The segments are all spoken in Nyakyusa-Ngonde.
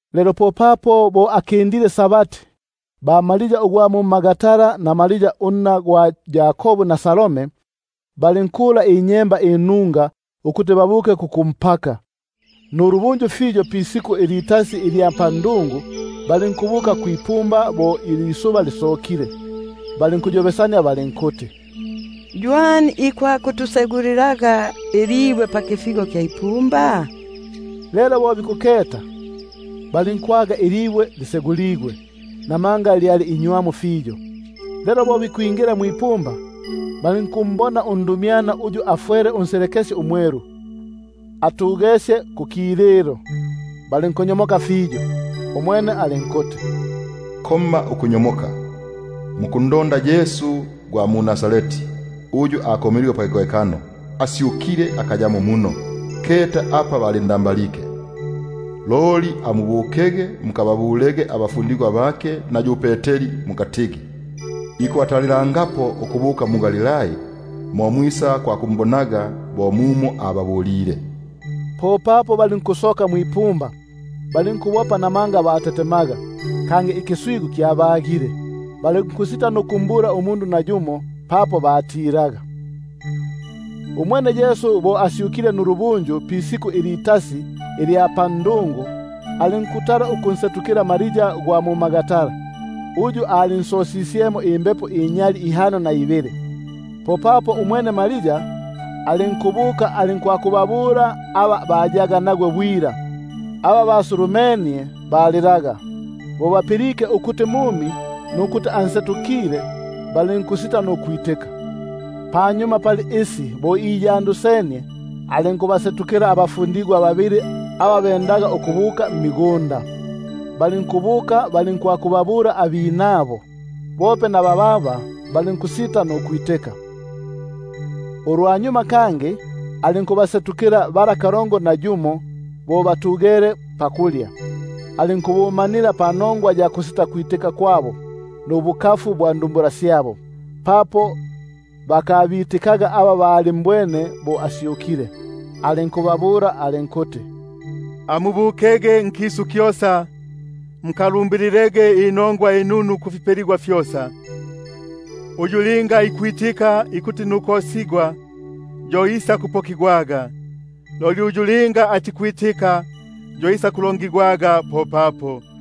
Lelo bo akindile Sabati, popapo ba-Maria ugwa mu-Magdala na Maria unna gwa Yakobu, na Salome, balinkula inyemba inunga ukuti babuke kukumpaka. Nulubunju fiyo pisiku ilitasi ilya ndungu, balinkwisa kwipumba bo ilisuba lisokile. Balinkuyobesania balinkuti: Ywani ikwakutusegulilaga ilibwe pakifigo kya ipumba? Lelo bo bikuketa, balinkwaga ilibwe liseguligwe, — namanga lyali inywamu fiyo. Lelo bo bikwingila mwipumba, balinkumbona undumyana uyu afwele unselekesye umwelu atugesye kukililo, balinkunyomoka fiyo. Umwene alinkuti: Komma ukunyomoka, mukundonda Yesu gwa mu-Nazareti, uyu akomeligwe pakikohekano, — asyukile, akayamo muno; keta apa balinda- mbalike. Loli amubukege mukababulege abafundigwa bake na yu Peteri mukatigi: Ikubalongolelangapo ukubuka mu- Galilai, mo mwisakwakumbonaga bo mumo ababulile. Popapo balinkusoka nukubopa ukufuma kwipumba, papo batetemaga, kangi ikiswigu kyabagile, balinkusita nukumbula nayumo umundu papo batilaga. [Umwene bo asyukile nulubunju pisiku ilitasi ilya ndungu, alinkutala ukunsetukila Maria ugwa mu-Magdala, uyu alinsosisyemo imbepo inyali ihano na ibili. Umwene yo alinkubuka nukwakubabula aba hayaga nagwe, aba basulu- menie balilaga. Bo bapilike ukuti mumi, nukuti ansetukile, balinkusita nukwitika. Panyuma pali isi bo iyandusenie, alinkubasetukila abinabo babili aba bendaga ukubuka mmigunda. Balinkubuka balinkwakubabula abinabo; bope na bababa balinkusita nukubitika. Ulwanyuma alinkubasetukila kalongo na yumo bala bo batugele pakulya; alinkubumanila panongwa ya kusitakwitika kwabo nubukafu bwa ndumbula syabo, papo bakabitikaga aba balimbwene bo asyukile. Alinkubabula alinkuti: Amubukege nkisu kyosa, mukalumbililege inongwa inunu kufipeligwa fyosa. Uyu linga ikwitika nukosigwa yo isakupokigwaga, loli uyu linga atikwitika yo isakulongigwaga nukutobesigwa.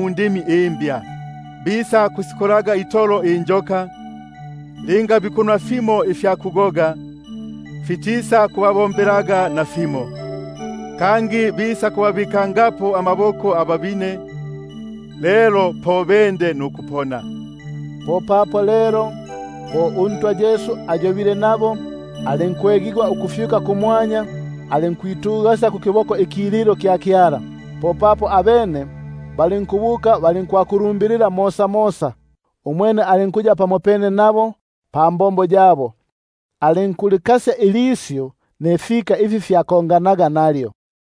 indimi imbya; bisakusikolaga itolo injoka; linga bikunwa fimo ifya kugoga, fitisakubabombelaga nafimo, kangi bisakubabikangapo amaboko ababine, lelo po bende nukupona. Popapo lelo bo uNtwa Yesu ayobile nabo, alinkwegigwa ukufyuka kumwanya, alinkwitugasya kukiboko ikililo kya Kyala. Popapo abene balinkubuka balinkwakulumbilila mosamosa, umwene uNtwa alinkuya nabo pambombo, alinkulikasya ilisyu nifika ifi fyakonganaga nalyo.]